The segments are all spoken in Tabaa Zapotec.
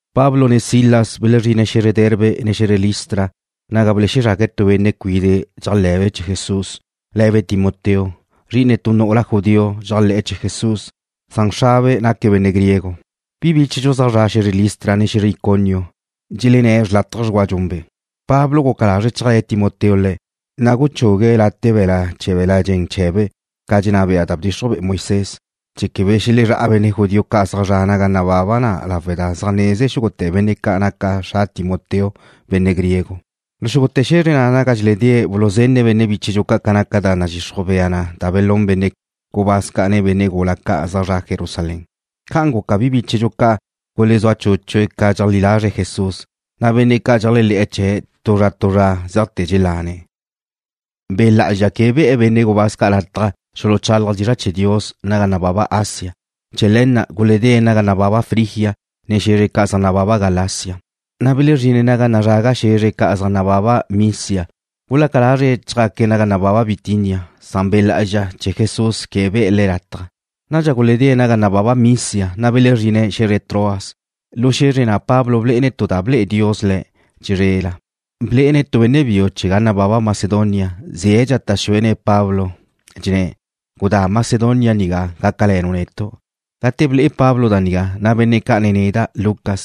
Pablo ne Silas belezrine̱' xe̱zre Derbe, ne xe̱zre Listra naga belexezrague̱' tu benne' cuide' dxéajle̱be' chee̱ Jesús, le̱be' Timoteo, zri'ine tu nu'ula judío dxéajle̱'e̱ chee̱ Jesús, san xrabe' naque̱' benne' griego. Bi bíchedxu zaj zre̱'e̱ xe̱zre Listra, ne xe̱zre Iconio dxelenné̱' xrlátaje dxgua dxunbe'. Pablo guca lazre̱' chéajle̱ Timoteo le̱', na' guchugue̱' late' be̱la' chee̱ be̱l-la' dxen chee̱be' ca dxenná bea da bdxixruj be'e Moisés, chee̱ quebe xelezrá'a benne' judío ca' zaj zre̱'e̱ naga nababa na lawe' da zaj neze xúgute̱ benne' ca' naca xra Timoteo benne' griego. Lu xúgute̱ xe̱zre naga dxeledée̱' buluzenne̱' benne' bíchedxu ca' ca naca da zaj nadxixruj bea na belún benne' gubáz ca', ne benne' gula ca' zaj zre̱'e̱ Jerusalén. Ca'an guca bi bíchedxu ca' gulezúa chúchue̱' ca dxeleajlí lazre̱' Jesús, na' benne' ca' dxeléajle̱'e̱ chee̱', tu zra tu zra zeajte̱ dxelane̱'. Be' Lá'azxa quebe be̱'e̱ benne' gubáz ca' lataj xuluchálaje̱' dizra' chee̱ Dios naga nababa Asia. Chee̱ le̱ na' guledée̱' naga nababa Frigia, ne xe̱zre ca' zaj nababa Galacia. Belezrine̱' naga nazraga xe̱zre ca' zaj nababa Misia. Gulaca lazre̱' chjaque̱' naga nababa Bitinia, san Be' Lá'azxa chee̱ Jesús quebe be̱'e̱ le̱' lataj. Nadxa guledée̱' naga nababa Misia, na' belezrine̱' xe̱zre Troas. Lu xe̱zre na' Pablo blé'ene̱' tu da ba ble'e Dios le̱' chizrela, blé'ene̱' tu benne' biu chee̱ ga nababa Macedonia, ze̱' dxata' xuene̱' Pablo, dxenné̱': “Gudá Macedonia nigá, gácale̱nu' netu'.” Gate ble'e Pablo da nigá, na' benne' ca', ne neda', Lucas,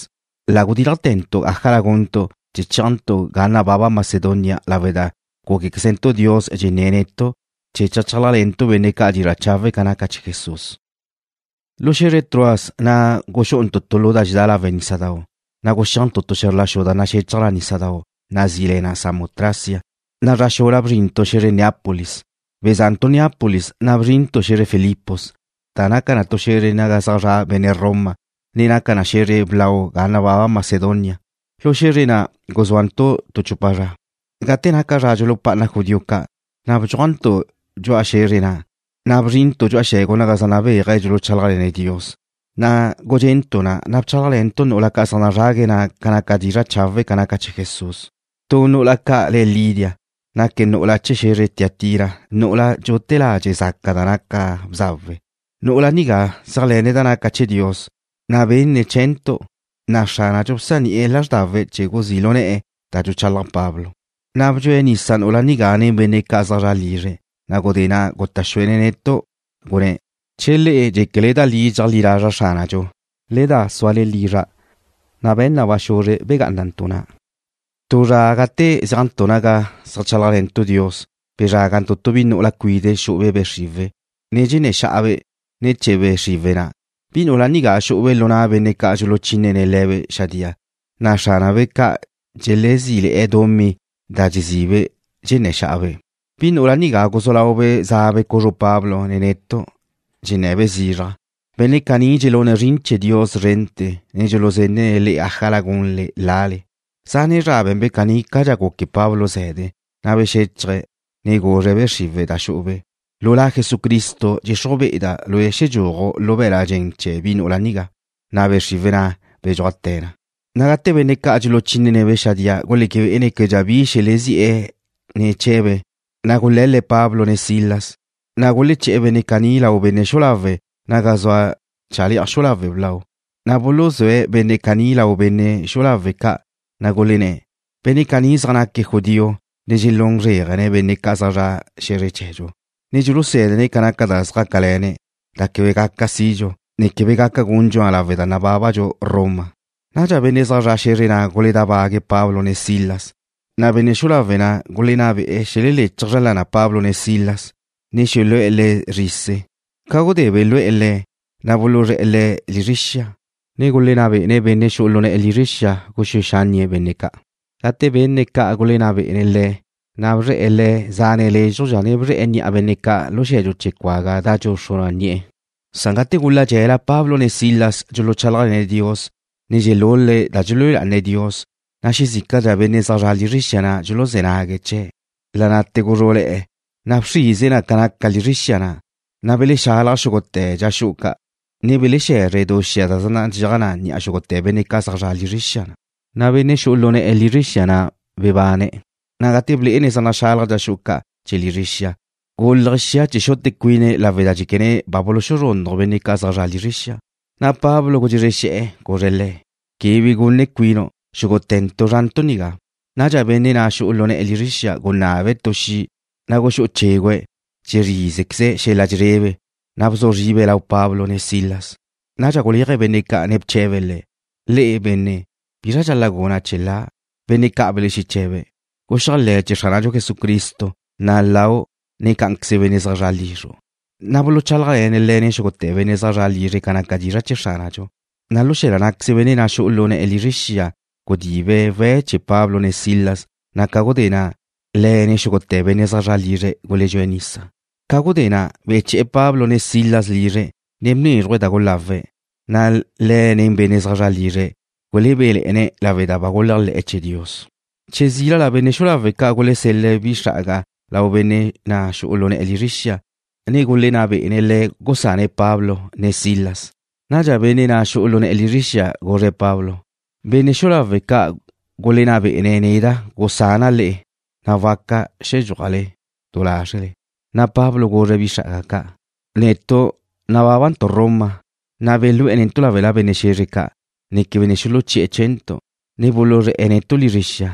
la gudílajte̱ntu' ájala guntu' chee̱ chéajntu' ga nababa Macedonia lawe' da gúquequezentu' Dios dxenné̱' netu' chee̱ cheajchálajle̱ntu' benne' ca' dizra' chawe' ca naca chee̱ Jesús. Lu xe̱zre Troas na' guxú'untu' tu lu da dxedá lawe' nísadau', na' guxéajntu' tu xe̱zr la xu da naxechaj nísadau', nazí le na Samotracia, na' zra xula bzrintu' xe̱zre Neápolis. Beza'ntu' Neápolis, na' bzrintu' xe̱zre Filipos, da naca tu xe̱zre naga zaj zra' benne' Roma, ne naca xe̱zre blau ga nababa Macedonia. Lu xe̱zre na' guzúantu' tu chupa zra. Gate naca zra dxulupá'ana judío ca', na' bdxúajntu' dxu'a xe̱zre na', ne bzrintu' dxu'a xe̱gu naga zaj nabéaje̱' dxeajlechálajle̱ne̱' Dios. Gudxe'ntu' na' ne bchálajle̱ntu' nu'ula ca' zaj nazrague̱' na' ca naca dizra' chawe' ca naca chee̱ Jesús. Tu nu'ula ca' le̱' Lidia, naque̱' nu'ula chee̱ xe̱zre Tiatira, nu'ula dxute̱' ladxe' zaca da naca bzawe. Nu'ula nigá zéajle̱ne̱' da naca chee̱ Dios, na' benne̱' chee̱ntu', na' Xránadxu bzani'e̱ lázrdawe̱' chee̱ guzí' lu ne̱'e̱ da dxuchalaj Pablo. Na' bdxue nisa nu'ula nigá nen benne' zaj zre̱'e̱ lizre̱'. Gudé na' guta' xuene̱' netu', gunné̱': ―Che le'e dxéquele da li dxeajlí lazra' Xránadxu, le da súale lizra'. Na' be̱ne̱' ba xuzre begá'anantu' na'. Tu zra gate zéajntu' naga zeajchálajle̱ntu' Dios, bezrágantu' tu bi nu'ula cuide' xu'ube' be' xriwe̱', ne dxenné̱ xa'abe' ne̱ chee̱ be' xriwe̱' na'. Bi nu'ula nigá xú'ube' lu na' benne' ca' dxuluchínene̱' le̱be' xadía, na' xránabe' ca' dxelezíle̱'e̱ dumí da dxezibe', dxenné̱ xa'abe'. Bi nu'ula nigá guzú laube' za'be' cuzru Pablo ne netu', dxennabe' zizraj: ―Benne' caní dxelune̱' zrin chee̱ Dios szrente̱, ne dxuluzenne̱' le'e ájala gunle lale. Zane' zra be̱nbe' caní cadxa guque Pablo ze̱de, na' bexéchaje̱', ne guzre̱' be' xriwe̱' da xu'ube': ―Lu La Jesucristo dxenná be'eda' lue' xedxúaju' lu be̱l-la' dxen chee̱ bi nu'ula nigá. Na' be' xriwe̱' na' bedxúajte̱ na. Gate benne' ca' dxuluchínene̱'-be' xadía guleque bé'ene̱' québedxa bi xelexezí'e̱ ne̱ chee̱be', na' gule̱l-le̱' Pablo ne Silas, na' guleché̱'e̱ benne' caní lau benne' xu'u lawe' naga zua chale'aj xu'u lawe' blau. Na' buluzúe̱' benne' caní lau benne' xu'u lawe' ca', na' gulenné̱': ―Benne' caní zaj naque̱' judío ne dxelún zréajene̱' benne' zaj zre̱'e̱ xe̱zre chee̱dxu, ne dxulusé̱dene̱' ca naca da zjácale̱ne̱', da quebe gaca sidxu, ne quebe gaca gundxu na lawe' da nábabadxu Roma. Nadxa benne' zaj zre̱'e̱ xe̱zre na' guledábague̱' Pablo ne Silas, na' benne' xu'u lawe' na' gulenná be'e xeleléchaje̱' zra lana Pablo ne Silas, ne xelu'e̱ le̱' zrise. Ca gudé belúele̱'e̱ le̱', na' buluzré̱'e̱ le̱' lizre xia, ne gulenná bé'ene̱' benne' xu'u lu ne̱'e̱ lizre xia na' guxúe xánnie̱' benne' ca'. Gate benne̱' ca gulenná be'e̱, na' bzre̱'e̱ le̱' zane' lézxudxa ne bzre̱'e̱ ni'a benne' ca' lu xe̱dxu chee̱ cuaga da dxuxru na ni'e̱. Gate gula dxe̱la Pablo ne Silas dxuluchálajle̱ne̱' Dios, ne dxelul-le̱' da dxelúe lá'ane̱' Dios, na' xezícadxa benne' zaj zre̱'e̱ lizre xia dxuluzé̱ nague̱' chee̱'. La' na'te̱ guzrú'le̱'e̱ da bxrize na ca naca lizre xia, na' belexalaj xúgute̱ dxa xu'u ca', ne belexexe̱zre du xia da zaj nadxéaj ni'a xúgute̱ benne' ca' zaj zre̱'e̱ lizre xia. Na' benne' xu'u lu ne̱'e̱ lizre xia na' bebane̱', ne gate blé'ene̱' zaj naxalaj dxa xu'u ca' chee̱ lizre xia, gúlaje̱' xia chee̱ xute cuine̱' lawe' da dxéquene̱' ba buluxuzrúnnaj benne' ca' zaj zre̱'e lizre xia. Pablo gudxezre xe̱'e̱, guzre̱' le̱': ―Quebe bi gune cuinu'. Xúgute̱ntu' zúantu' nigá. Nadxa benne' na' xu'u lu ne̱'e̱ lizre xia gunabe̱' tu xi', na' guxú'u chégüe̱', dxezrízequeze̱' xel-la' dxezrebe, na' bzu zribe̱' lau Pablo ne Silas. Nadxa guléaje̱' benne' ca' ne bche̱be̱' le̱': ―Le'e, benne', ¿bizra dxal-la' guna' chee̱ la'? Benne' ca' belexeche̱be̱': ―Guxéajle̱ chee̱ Xránadxu Jesucristo, na' lau', ne cá'anqueze benne' zaj zre̱'e lizru'. Na' buluchálajle̱ne̱' le̱', ne xúgute̱ benne' zaj zre̱'e̱ lizre̱' ca naca dizra' chee̱ Xránadxu. Lu xe̱la ná'queze benne' na' xu'u lu ne̱'e̱ lizre xia gudibe̱' we̱' chee̱ Pablo ne Silas, na' ca gudé na', le̱' ne xúgute̱ benne' zaj zre̱'e̱ lizre̱' guledxúe̱' nisa. Ca gudé na' beche̱'e̱ Pablo ne Silas lizre̱', na' bnézruje̱' da gulawe̱', na' le̱' ne benne' zaj zre̱'e̱ lizre̱' gulebéle̱'e̱ne̱' lawe' da ba guléajle̱'e̱ chee̱ Dios. Che zílala benne' xu'u lawe' ca' gulesel-le̱' bi xra'aga lau benne' na' xu'u lu ne̱'e̱ lizre xia, ne gulenná bé'ene̱' le̱' gusane̱' Pablo ne Silas. Nadxa benne' na' xu'u lu ne̱'e̱ lizre xia guzre̱' Pablo: ―Benne' xu'u lawe' ca' gulenná bé'ene̱' neda' gusana' le'e. Na'a waca xedxúajle du lázrele. Pablo guzre̱' bi xra'aga ca': ―Netu' nabábantu' Roma, na' belú'e̱ netu' láwela benne' xe̱zre ca', ne quebe ne xuluchí'e̱ chee̱ntu', na' buluzré̱'e̱ netu' lizre xia.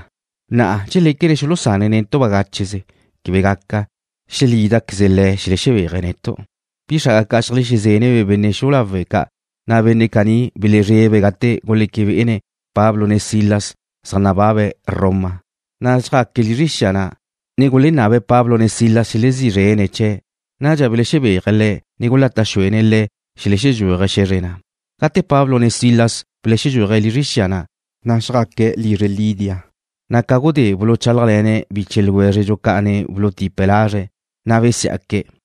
Na'a ¿dxeléquene̱' xulusane̱' netu' bagácheze? Quebe gaca. Xelída lé̱queze̱' xelexebéaje̱' netu'. Bi xra'aga ca' xeajlexezénnebe' benne' xu'u lawe' ca', na' benne' caní belezrebe̱' gate guleque bé'ene̱' Pablo ne Silas zaj nababe̱' Roma. Na' xjaque̱' lizre xia na', ne gulenabe̱' Pablo ne Silas xelezí zrene̱' chee̱'. Nadxa belexebéaje̱' le̱', ne gulata' xuene̱' le̱' xelexedxúaje̱' xe̱zre na'. Gate Pablo ne Silas belexedxúaje̱' lizre xia na', na' xjaque̱' lizre Lidia, na' ca gudé buluchálajle̱ne̱' biche ljwézredxu ca', ne bulutipe̱' lazre̱', na' besiá'que̱'.